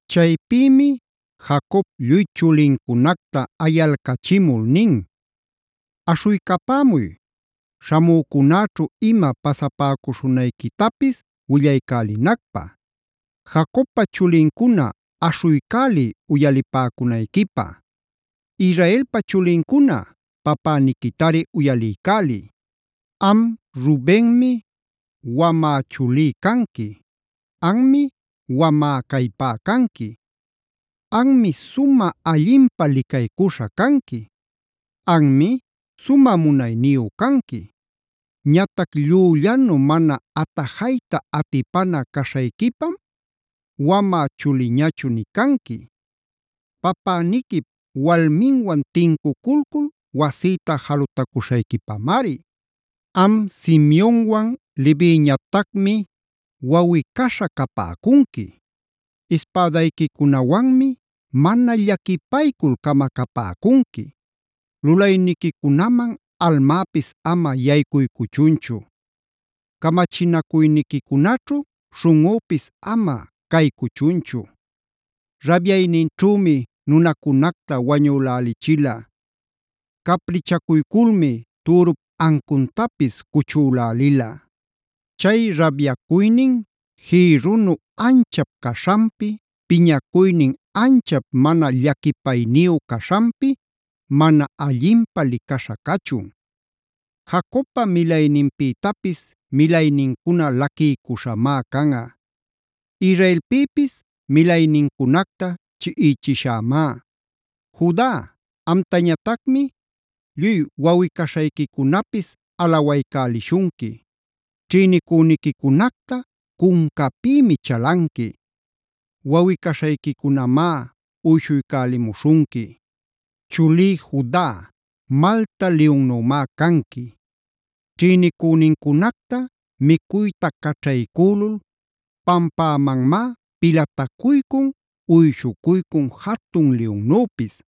Chaypïmi Jacob lluy chulincunacta ayalcachimul nin: “Aśhuycapämuy, śhamücunäćhu ima pasapäcuśhunayquitapis willaycälinacpä. “Jacobpa chulincuna aśhuycäliy uyalipäcunayquipä. Israelpa chulincuna papäniquitari uyaliycäliy. Am Rubenmi wamä chulí canqui. Anmi wamä callpá canqui; Anmi sumä allinpä licaycuśha canqui; Anmi sumä munayniyu canqui. Ñatac llüllanu mana atajayta atipana caśhayquipam wamä chuliñachu nï canqui;a papäniquip walminwan tincuculcul wasïta jalutacuśhayquipamari. “Am Simeonwan, Leviñatacmi wawꞌi-caśha capäcunqui. Ispädayquicunawanmi mana llaquipaycul camacapäcunqui. Lulayniquicunaman almäpis ama yaycuycuchunchu. Camachinacuyniquicunaćhu śhunꞌüpis ama caycuchunchu; rabyayninćhümi nunacunacta wañülälichila.b Caprichacuyculmi türup ancuntapis cuchülälila. Chay rabyacuynin jïrrunu anchap caśhanpi, piñacuynin anchap mana llaquipayniyu caśhanpi mana allinpä licaśha cachun. Jacobpa milayninpïtapis milaynincuna laquiycuśhamá canꞌa. Israelpïpis milaynincunacta chiꞌichishämá. “Juda, amtañatacmi lluy wawꞌi-caśhayquicunapis alawaycälishunqui. Ćhïnicüniquicunacta cuncapïmi chalanqui; wawꞌi-caśhayquicunamá uyshuycälimuśhunqui. Chulí Juda, malta liyunnümá canqui. Ćhïnicünincunacta micuyta caćhaycülul pampämanmá pilatacuycun, uyshucuycun, jatun liyunnüpis.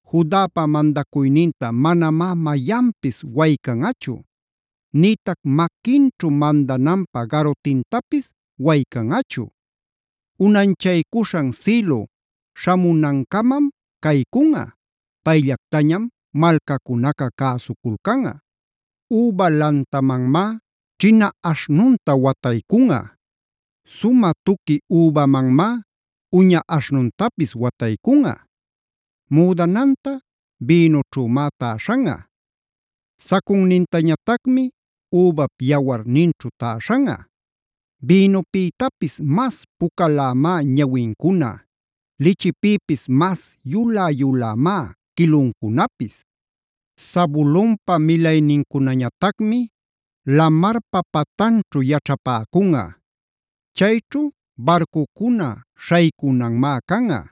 Judapa mandacuyninta manamá mayanpis waycanꞌachu, nïtac maquinćhu mandananpä garutintapis waycanꞌachu. Unanchaycuśhan Silohd śhamunancamam caycunꞌa; payllactañam malcacunaca cäsuculcanꞌa. Üba lantamanmá ćhina aśhnunta wataycunꞌa; sumä tuqui übamanmá uña aśhnuntapis wataycunꞌa. Müdananta bïnućhümá täśhanꞌa; sacunnintañatacmi übap yawarninćhu täśhanꞌa. Bïnupïtapis mas pucalämá ñawincuna; lichipïpis mas yulä-yulämá quiluncunapis. “Zabulonpa milaynincunañatacmi lamarpa patanćhu yaćhapäcunꞌa. Chayćhu barcucuna śhaycunanmá canꞌa.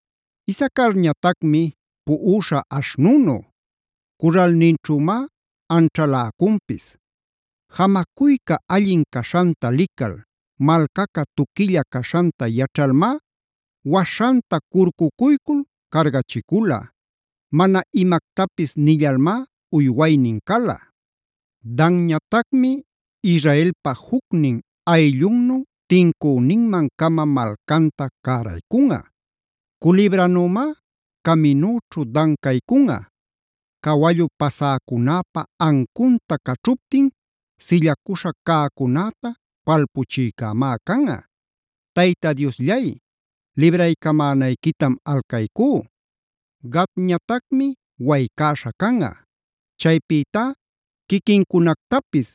“Isacarñatacmi puꞌuśha aśhnunu; curralninćhümá anćhaläcunpis. Jamacuyca allin caśhanta lical, malcaca tuquilla caśhanta yaćhalmá waśhanta curcucuycul cargachicula; mana imactapis nillalmá uywaynin cala. “Danñatacmi Israelpa jucnin ayllunnu tincüninman-cama malcanta cäraycunꞌa. Culibranümá caminüćhu Dan caycunꞌa; Cawallu pasäcunäpa ancunta caćhuptin sillacuśha cäcunäta palpuchïcämá canꞌa. ¡Tayta Diosllay, libraycamänayquitam alcaycú! “Gadñatacmi waycäśha canꞌa. Chaypïtá quiquincunactapis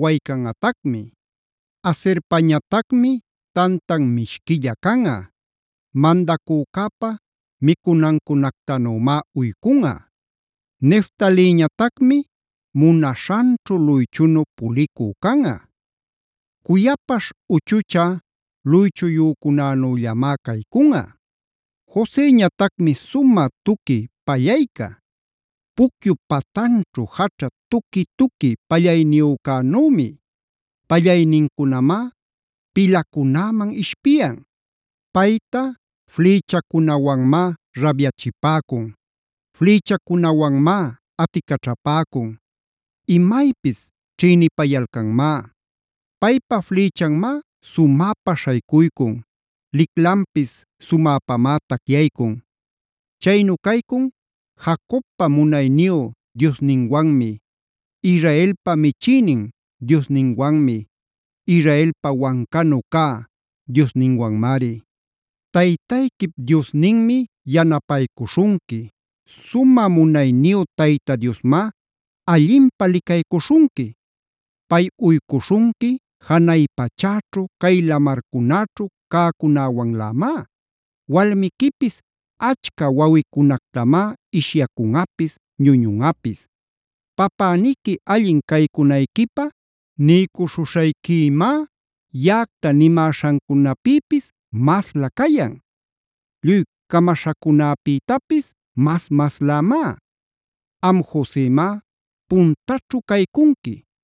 waycanꞌatacmi. “Aserpañatacmi tantan mishquilla canꞌa; Mandacücäpa micunancunactanümá uycunꞌa. “Neftaliñatacmi munaśhanćhu luychunu pulicü canꞌa; Cuyapaśh uchuchä luychuyücunänüllamá caycunꞌa. “Joseñatacmi sumä tuqui pallayca; pucyup patanćhu jaćha tuqui-tuqui pallayniyücänümi. Pallaynincunamá pilacunäman ishpiyan. Payta flïchacunawanmá rabyachipäcun; flïchacunawanmá aticaćhapäcun, imaypis ćhïnipayalcanmá. Paypa flïchanmá sumäpa śhaycuycun. Liclanpis sumäpamá tacyaycun. Chaynu caycun Jacobpa munayniyu Diosninwanmi, Israelpa michïnin Diosninwanmi, Israelpa wancanu cä Diosninwanmari. Taytayquip Diosninmi yanapaycuśhunqui. Sumä munayniyu Tayta Diosmá allinpä licaycuśhunqui. Pay uycuśhunqui janay pachäćhu, cay lamarcunäćhu cäcunäwanlämá; walmiquipis achca wawicunactamá ishyacunꞌapis, ñuñunꞌapis. Papäniqui allin caycunayquipä niycuśhuśhayquïmá yaꞌacta nimäśhancunapïpis masla cayan; lluy camaśhacunäpïtapis mas-maslämá. Am Josemá puntaćhu caycunqui,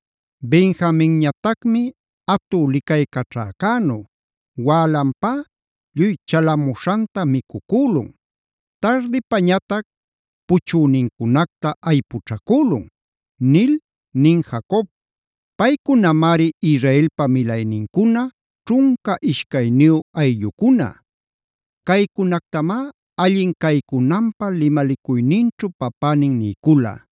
“Benjaminñatacmi atü licaycaćhäcänu; wälanpá lluy chalamuśhanta micucülun; tardipañatac puchünincunacta aypućhacülun” nil nin Jacob. Paycunamari Israelpa milaynincuna, ćhunca ishcayniyu ayllucuna. Caycunactamá allin caycunanpä limalicuyninćhu papänin niycula.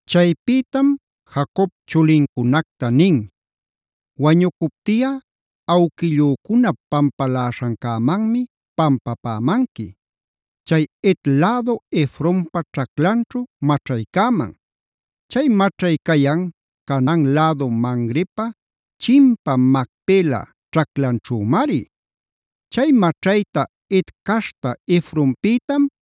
Chaypïtam Jacob chulincunacta nin: “Wañucuptiꞌa awquillücunap pampaläśhancämanmi pampapämanqui; chay Het lädu Efronpa ćhaclanćhu maćhaycäman. Chay maćhay cayan Canaan lädu Mamrepa chimpa Macpela ćhaclanćhümari. Chay maćhayta Het caśhta Efronpïtam,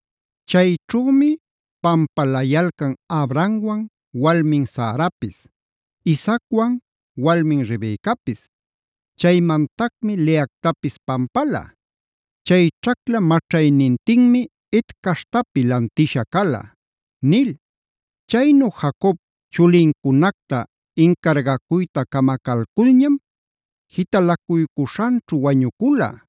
Chayćhümi pampalayalcan Abrahamwan walmin Sarapis;h Isaacwani walmin Rebecapis. Chaymantacmi Leactapis pampala. Chay ćhacla maćhaynintinmi Het caśhtapi lantisha cala” nil. Chaynu Jacob chulincunacta incargacuyta camacalculñam jitalacuycuśhanćhu wañucula.